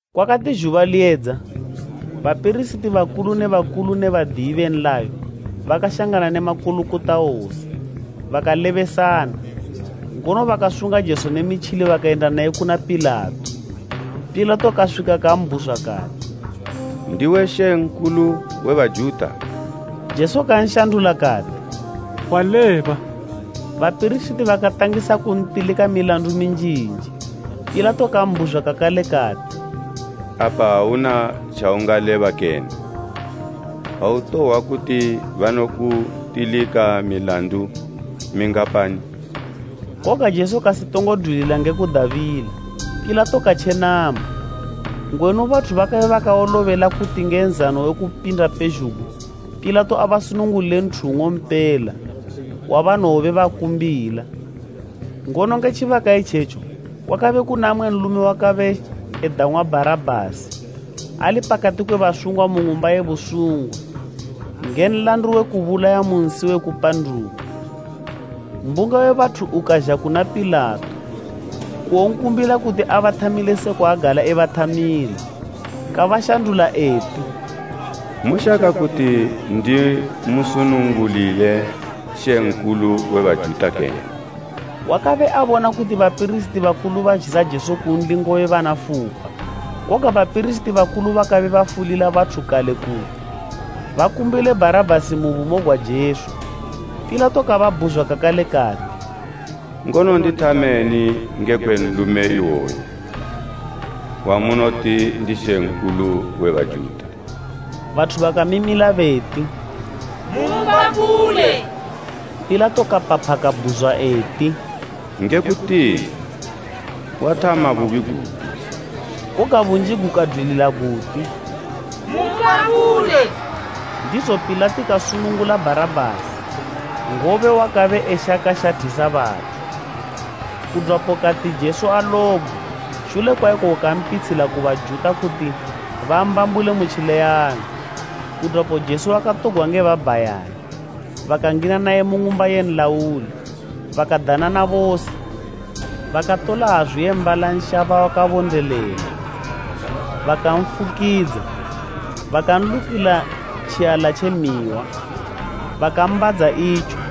Kwakati zhuba liyedza, bapirisiti bakulu ne bakulu ne badiyi be nlayo bakashangana ne makulukota wose, bakalebesana, ngono bakasunga Jesu nge mitjili bakayenda naye kuna Pilato. Pilato kaswika kambhuzwa kati, “Ndiwe Mambo we Bajuta?” Jesu kanshandula kati, “Waleba.” Bapirisiti bakatangisa kuntilika milandu minjinji. Pilato kambhuzwa kakale kati, “Apa auna tjaungaleba kene? Autohwa kuti banokutilika milandu mingapani?” Koga Jesu kasitongo dwilila nge kubadabila, Pilato katjenama. Ngwenu bathu bakabe bakawolobela kuti nge Nzano we Kupinda pezhugwi Pilato abasunungulile nthu ng'ompela, wabanobe bakumbila. Ngono nge tjibaka itjetjo, kwakabe kuna mmwe nlume wakabe edang'wa Bharabhasi ali pakati kwe basungwa mu ng'umba ye basungwa nge nlandu we kubulaya mu nsi we kupanduka. Mbunga we bathu ukazha kuna Pilato kuwonkumbila kuti abathamile sekwa agala ebathamila. Kabashandula eti, “Moshaka kuti ndimusunungulile Mambo we Bajuta kene?” Wakabe abona kuti bapirisiti bakulu bazhisa Jesu kunli ngobe bana fupa. Koga bapirisiti bakulu bakabe bafulila bathu kale kuti, bakumbile Bharabhasi mu bumo gwa Jesu. Pilato kababhuzwa kakale kati, “Ngono ndithameni ngekwe nlume iwoyu, wamunoti, ‘Ndi Mambo we Bajuta?’” Bathu bakamimila beti, “Mumbambule.” Pilato kapapha kabhuzwa eti, “Nge kutini, wathama bubi gupi?” Koga bunji gukadwilila guti, “Mumbambule.” Ndizo Pilato kasunungula Bharabhasi, ngobe wakabe eshaka shathisa bathu. Kudwapo kati Jesu alobgwe, shule kwa ikoko kampitshila ku Bajuta kuti bambambule mu tjileyanyo. Kudwapo Jesu wakatogwa nge babhayani bakangina naye mu ng'umba ye nlauli, bakadanana bose. Bakatola hazu ye mbala nshaba wakabondelela, bakanfukidza, bakanlukila tjiala tje mihwa, bakambadza itjo.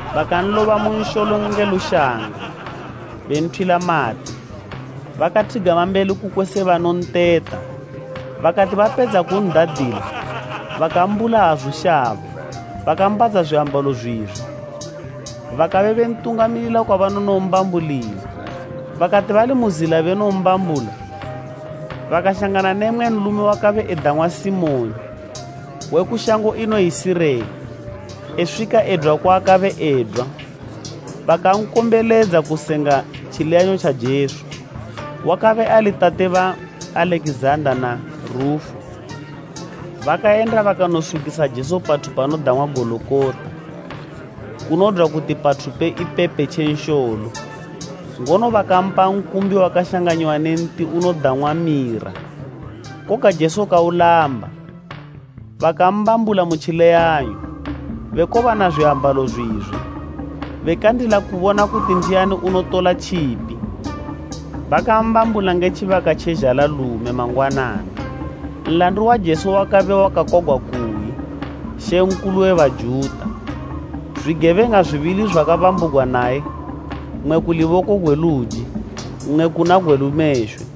Bakanloba mu nsholo nge lushanga, benthwila mate. Bakathigama mbeli kukwe se banonteta. Bakati bepedza kun'dadila, bakambula hazu shaba bakambadza zwiambalo zwizwe. Bakabe bentungamilila kwabanonombambulila. Bakati bali mu zila benombambula, bakashangana ne mmwe nlume wakabe edang'wa Simoni we ku shango inoyi Sirene, eswika edwa kwaakabe edwa bakankombeledza kusenga tjileyanyo tja Jesu. Wakabe ali tate ba Alekizanda na Rufu. Bakayenda bakanoswikisa Jesu pathu panodang'wa Gologota, kunodwa kuti pathu pe ipepe tje nsholo. Ngono bakampa nkumbi wakashanganyiwa ne nti unodang'wa mira, koga Jesu kaulamba. Bakambambula mu tjileyanyo, bekobana zwiambalo zwizwe, bekandila kubona kuti ndiani unotola tjipi. Bakambambula nge tjibaka tje zhanalume mangwanana. Nlandu wa Jesu wakabe wakakwagwa kuyi, “MAMBO WE BAJUTA.” Zwigebeng'a zwibili zwakabambugwa naye, mmwe ku luboko gwe luji, mmwe kuna gwe lumeshwe. [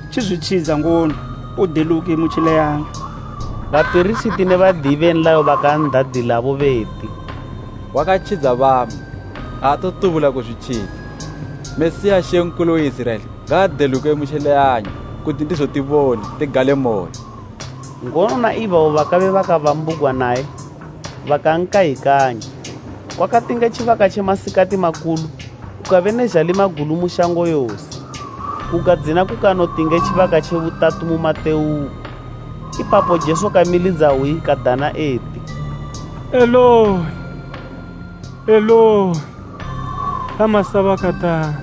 tjizwitjidza ngono, udeluke mu tjileyanyo!” Bapirisiti ne badiyi be nlayo bakan'dadilabo beti, “Wakatjidza bamwe, aatotubula kuzwitjidza. Mesiya, Mambo we Iziraela ngaadeluke mu tjileyanyo, kuti ndizo tibone, tigalemoyo.” Ngono na ibabo bakabe bakabambugwa naye bakankayikanya. Kwakati nge tjibaka tje masikati makulu, kukabe ne zhalima gulu mu shango yose, kukadzina kukanoti nge tjibaka tje butatu mu matewuko. Ipapo Jesu kamilidza hwi kadana eti, “Eloi, Eloi lama sabakatani?”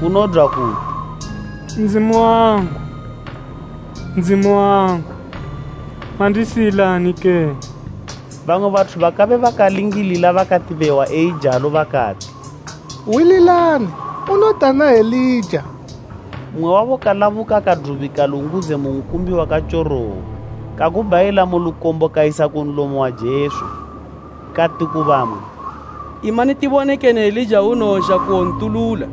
Kunodwa kuti, “Ndzimu wangu, Ndzimu wangu, mandisiyilani kene?” Bamwe bathu bakabe bakalingilila bakati behwa eijalo bakati, “Hwililani, unodana Elija.” Mmwe wabo kalabuka kadubika lungudze mu nkumbi wakatyorowa, kagubhayila mu lukombo kayisa ku nlomo wa Jesu, kati ku bamwe, “Imani tibone kene Elija unowozha kuwontulula.”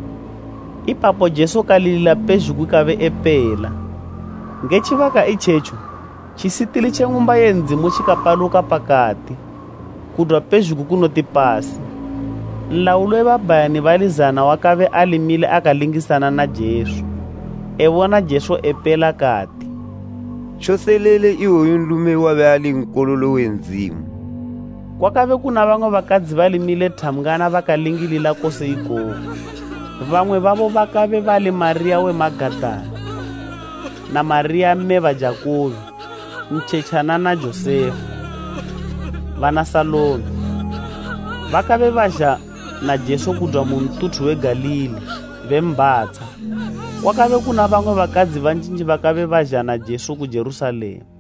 Ipapo Jesu kalilila pezhugwi kabe epela. Nge tjibaka itjetjo tjisitili tje ng'umba ye Ndzimu tjikapaluka pakati, kudwa pezhugwi kunoti pasi. Nlauli we babhayani bali zana wakabe ali mile akalingisana na Jesu, ebona Jesu epela kati, “Tjoselele iwoyu nlume wabe ali Nkololo we Ndzimu.” Kwakabe kuna bamwe bakadzi bali mile thambgwana bakalingilila kose ikoku. Bamwe babo bakabe bali Mariya we Magadala na Mariya, mme ba Jakubo ntjetjana na Josefa, bana Salome. Bakabe bazha na Jesu kudwa ku ntuthu we Galili, bembhatsha. Kwakabe kuna bamwe bakadzi banjinji bakabe bazha na Jesu ku Jerusalema.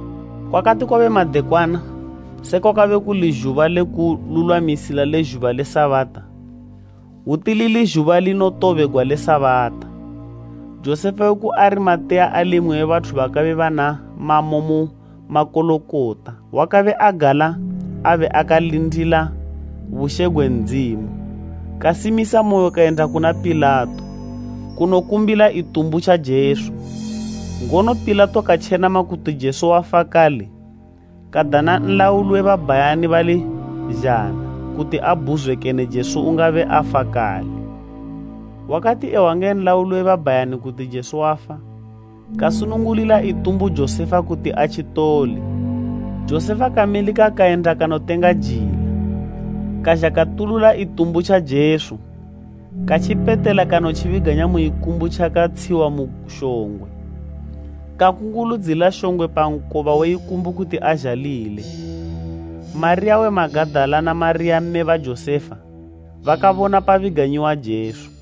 Kwakati madekwana eswika, iko kuli Zhuba le Kululwamisila le Sabata, lili zhuba linotobela le Sabata, Josefa we ku Arimateya ali mmwe bathu bakabe bana mamo mu makulukota wakabe agala abe akalindila bushe gwe Ndzimu, kasimisamoyo kayenda kuna Pilato kunokumbila itumbu tja Jesu. Ngono Pilato katjenama kuti Jesu wafa kale, kadana nlauli we babhayani bali zana kuti ambhuzwe kene Jesu ungabe afa kale. Wakati ehwa nge nlauli we babhayani kuti Jesu wafa, kasunungulila itumbu Josefa kuti atjitole. Josefa kamilika kayenda kanotenga jila, kazha katulula itumbu tja Jesu, katjipetela kanotjibiganya mu ikumbu tjakatshiwa mu shongwe. Kakunguludzila shongwe pa nkoba we ikumbu kuti azhalile. Mariya we Magadala na Mariya mme ba Josefa bakabona pabiganyiwa Jesu.